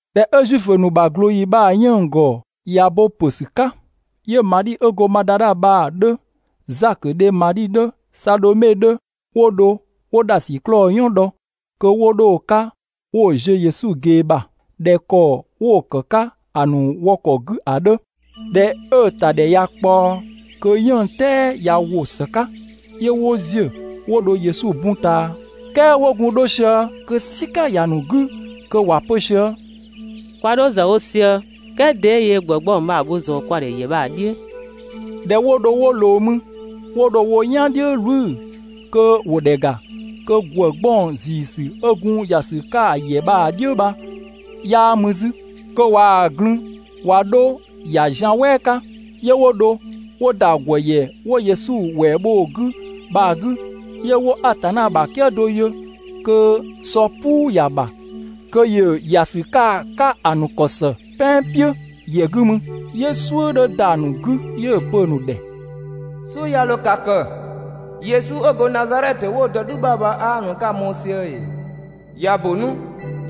꞊Dhɛ 'ö Zuifö ‑nu ꞊glooyi bha‑ 'yënng‑ ‑gɔ ꞊ya bo ‑pö ‑sü 'ka, 'yö Madhi 'ö go Madadha bha‑ 'dhö, Zakö dhe Madhi 'dhö, Sadhome 'dhö, 'wo dho 'wo ‑dhasiklɔɔ "yɔn dhɔ, kö 'wo 'dho‑ 'ka 'wo‑ ziö Yesu ꞊gee ‑bha (꞊dhɛ ‑kɔ 'wo‑ ‑kë 'ka ‑a ‑nu wɔ ‑kɔ 'gü ‑a 'dhö). ꞊Dhɛ 'ö‑ ‑ta ‑dhɛ ꞊ya ꞊kpaɔ, kö 'yënng‑ "tɛɛ ꞊ya ‑wo ‑së 'ka, 'yö 'wo ‑ziö 'wo dho Yesu bun ꞊taa. "Kɛɛ 'wo gun 'dho sië kö "sika ‑ya ‑nu 'gü, kö ‑wa pö sië: «Kwa 'dho ‑zë wo sië, "kɛɛ 'de yöö ‑gwë 'gbɔng bha‑ bho ꞊zɔɔ kwa ‑dhɛ ‑yɛ bha‑ "dhiʋ̈?» ꞊Dhɛ 'wo dho 'wo ꞊loo mü, 'wo dho wo "yan "dhiʋ̈ "wlü kö ‑wo ‑dhɛ ‑ga, kö ‑gwë 'gbɔng ‑ziisü 'ö gun ‑ya ‑sü 'ka ‑yɛ bha‑ "dhiʋ̈ bha 'yaa mü 'zü, kö ꞊waa‑ glün‑ ꞊wa 'dho‑ ‑ya zian "wɛɛ 'ka. 'Yö 'wo dho 'wo ‑da ‑gwë ‑yɛ 'wo Yesu ‑wɛɛ bho‑ 'gü bha‑ 'gü, 'yö 'wo Atanna ‑bha "kië do yö kö sɔ "puu ‑ya ‑bha kö ‑yö ‑ya ‑sü 'ka‑ 'ka ‑a ‑nu ‑kɔ ‑së "pɛan "piʋ̈ ‑yɛ 'gü mü. 'Yö "suʋ̈ 'dhö ‑da ‑a ‑nu 'gü. 'Yö‑ pö‑ ‑nu ‑dhɛ: «"Suʋ̈ 'ya 'dho ka kë, Yesu 'ö go Nazadhɛtö 'wo‑ dɔ "dhü ‑bha bha 'aa mü 'ka‑ mɔɔ‑ sië ‑ee? ꞊Ya ‑bö 'nu,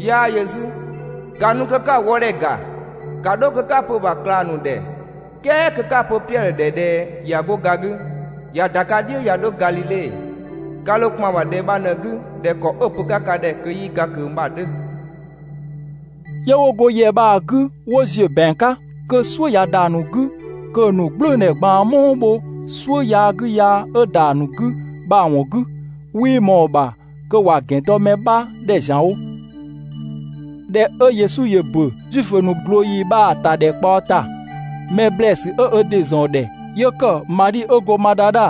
'yaa yö 'zü, ‑ka nu kö 'ka‑ wɔdhɛ ‑ga! ‑Ka 'dho kö 'ka‑ pö‑ ‑bha ꞊klang ‑nu ‑dhɛ, "kɛɛ kö 'ka‑ pö Piɛdhö ‑dhɛ ꞊dhɛ ꞊ya 'go ga 'gü, ꞊ya ‑da ka "dhiʋ̈ ꞊ya 'dho Gadhidhe. Ka ‑dho ‑kpan ‑bha ‑dhɛ bha ꞊në‑ 'gü ꞊dhɛ ‑kɔ 'ö‑ pö‑ 'ka ka ‑dhɛ kö 'yii ga ꞊kö bha‑ 'dhö.» 'Yö 'wo go ‑yɛ bha‑ 'gü 'wo ‑ziö ‑bɛang 'ka, kö "suʋ̈ ꞊ya ‑da ‑nu 'gü kö‑ ‑nu "gblʋ̈ʋ̈dhɛ ꞊gbaan "muu bho "suʋ̈ yaa 'gü yaa 'ö ‑da ‑a ‑nu 'gü bha‑ ‑wɔn 'gü, 'wii ꞊mɔɔ‑ ‑bha kö ‑wa ‑gɛn dɔ mɛ bha ‑dhɛ ‑zianwo. [꞊Dhɛ 'ö Yesu ‑yö ‑bö Zuifö ‑nu ꞊glooyi bha‑ ‑tadhɛkpaɔ ‑ta, mɛ ‑blɛɛsü 'ö ö ‑dɩ ‑zɔn ‑dhɛ 'yö ‑kë Madhi 'ö go Madadha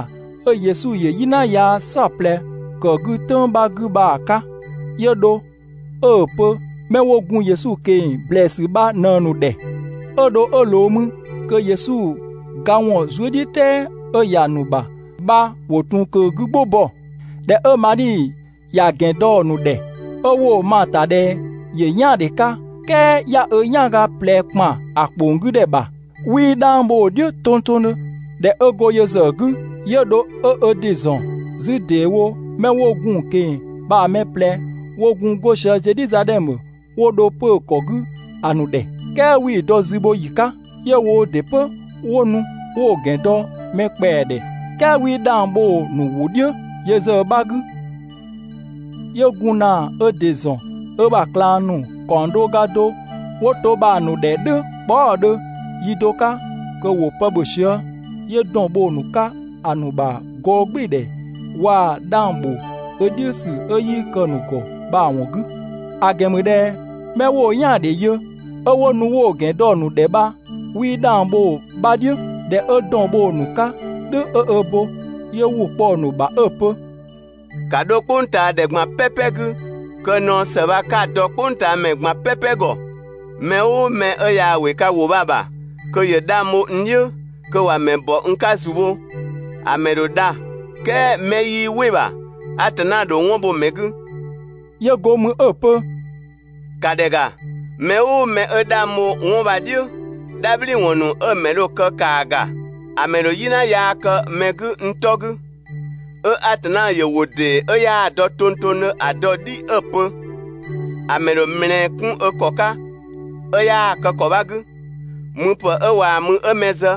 'ö Yesu ‑yö "yina yaa "saɔplɛ ‑kë 'gü "tʋ̈ng 'bha 'gü bha‑ 'ka. 'Yö dho 'ö‑ pö 'mɛ 'wo gun Yesu ꞊keng‑ ‑blɛɛsü bha ꞊në‑ ‑nu ‑dhɛ. 'Ö dho 'ö ꞊loo mü kö Yesu ga ‑wɔn zuëdhiʋ̈tɛɛ 'ö ‑ya ‑nu ‑bha bha ‑wo ‑tun ꞊kö‑ 'gü "gbʋ bɔ‑. ꞊Dhɛ 'ö Madhi ‑ya ‑gɛn dɔ‑ ‑nu ‑dhɛ, 'ö 'wo‑ ma‑ ‑ta ꞊dhɛ ‑yö "yaandhe 'ka, "kɛɛ 'ya 'ö "yanga ꞊plɛ ‑kpan ‑a ‑kpong 'gü ‑dhɛ ‑bha, 'wii 'dhang bho‑ "dhiʋ̈ tongtongdhö. ꞊Dhɛ 'ö go yö ‑zë 'gü, 'yö dho 'ö ö ‑dɩ ‑zɔn 'zü ‑deewo 'mɛ 'wo gun‑ ꞊keng‑ bha‑ mɛ ꞊plɛ 'wo gun 'go sië Zedhizadhɛmö, 'wo dho 'pö‑ ‑kɔ 'gü ‑a ‑nu ‑dhɛ, "kɛɛ 'wii‑ dɔ zü bho ‑yi 'ka. 'Yö woo ‑dɩ 'pö 'wo nu 'wo‑ ‑gɛn dɔ mɛ ‑kpɛa ‑dhɛ, "kɛɛ 'wii 'dhang bho‑ ‑nu ‑wʋ "dhiʋ̈ yö ‑zë 'bha 'gü. 'Yö gun ‑na ö ‑dɩ ‑zɔn ö ‑bha ꞊klang ‑nu ‑kaɔng do ga do 'wo to bha‑ ‑nu ‑dhɛ "dhʋ̈ kpɔɔ" ‑ɔɔdhö yi do 'ka kö ‑wo pë ‑bhö sië. 'Yö ‑dɔn bho‑ ‑nu 'ka ‑a ‑nu ‑bha gɔɔgbɩɩdhɛ waa‑ 'dhang ‑bho ö "dhiʋ̈ ‑sü 'ö 'yii kë‑ ‑nu ‑gɔ bha‑ ‑wɔn 'gü. ‑A ‑gɛn ‑mü ꞊dhɛ 'mɛ 'wo‑ "yaandhe yö, 'ö 'wo nu 'wo‑ ‑gɛn dɔ‑ ‑nu ‑dhɛ bha, 'wii 'dhang bho‑ 'bha "dhiʋ̈. ꞊Dhɛ 'ö ‑dɔn bho‑ ‑nu 'ka "dhʋ̈ 'ö ö bo, 'yö ‑wʋ kpɔ‑ ‑nu ‑bha 'ö‑ pö: «‑Ka 'dho "kpʋngtaadhɛ ꞊gban "pɛpɛ 'gü kö naɔ ‑së bha 'ka‑ dɔ "kpʋngtaamɛ ꞊gban "pɛpɛ ‑gɔ. Mɛ "ʋʋ mɛ 'ö yaa‑ ‑wɩ ka ‑wʋ bha‑ ‑bha kö ‑yö 'dhang bho n "dhiʋ̈, kö ‑wa ‑mɛ ‑bɔ n 'ka ‑zu bho, ‑a ‑mɛ ‑dho dha, "kɛɛ 'mɛ 'yii "wɩ‑ ‑bha, Atanna ‑dho 'wɔn bho‑ ‑mɛ 'gü.» 'Yö go mü 'ö‑ pö: «‑Ka ‑dhɛ ‑ga: Mɛ "ʋʋ mɛ 'ö 'dhang bho 'wɔn bha‑ "dhiʋ̈, "dhabhliwɔn ‑nu 'ö‑ ‑mɛ dho‑ kë ‑kaa ‑ga, ‑a ‑mɛ ‑dho "yina yaa kë mɛ 'gü n 'tɔ 'gü, 'ö Atanna ‑yö ‑wʋ ‑dee 'ö‑ 'yaa‑ dɔ tongtongdhö ‑a dɔ‑ "dhi 'ö‑ pö. ‑A ‑mɛ ‑dho ‑mlɛɛ 'kun ö ‑kɔ 'ka 'ö 'yaa‑ kë ‑kɔ 'bha‑ 'gü, müpë 'ö waa mü 'ö mɛ zë,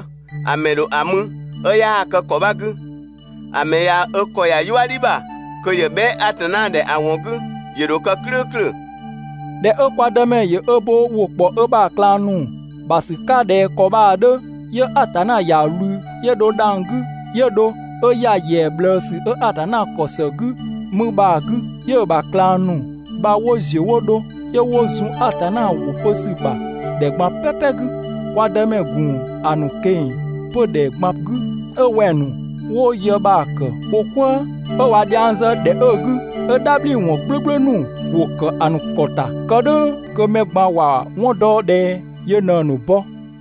‑a ‑mɛ ‑dho ‑a mü, 'ö 'yaa‑ kë ‑kɔ 'bha 'gü. ‑A ‑mɛ ꞊ya ö ‑kɔ ‑ya "yuëdhi ‑bha kö ‑yö bhɛa" Atanna ‑dhɛ ‑a ‑wɔn 'gü, ‑yö ‑dho kë "klʋ̈ʋ̈klʋ̈. ꞊Dhɛ 'ö kwa Dëmɛ ‑yö ö bo ‑wʋ ‑kpɔ ö ‑bha ꞊klang ‑nu ‑bha ‑sü 'ka ꞊dhɛ ‑kɔ bha‑ 'dhö, 'yö Atanna ‑ya ꞊wlü, 'yö dho dhang‑ 'gü, 'yö dho 'ö ‑ya ‑yɛa ꞊bhlëësü 'ö Atanna ‑kɔ ‑së 'gü mü bha‑ 'gü. 'Yö‑ ‑bha ꞊klang ‑nu bha 'wo ‑ziö 'wo dho, 'yö 'wo zun Atanna ‑wʋ pö ‑sü ‑bha ‑dhɛ ꞊gban "pɛpɛ 'gü. Kwa Dëmɛ ‑gun ‑a ‑nu ꞊keng‑ 'pö ‑dhɛ ꞊gban 'gü 'ö wɛng‑ ‑nu 'wo yë bha‑ kë wo "kwëë, 'ö ꞊wa dhiang zë ‑dhɛ 'ö‑ 'gü, 'ö "dhabhliwɔn "gblʋ̈gblʋ̈ ‑nu ‑wo ‑kë ‑a ‑nu ‑kɔ ‑ta, kë "dhʋ̈ kö mɛ ꞊gban ‑wa 'wɔn dɔ ꞊dhɛ yö ꞊në‑ ‑nu bɔ.]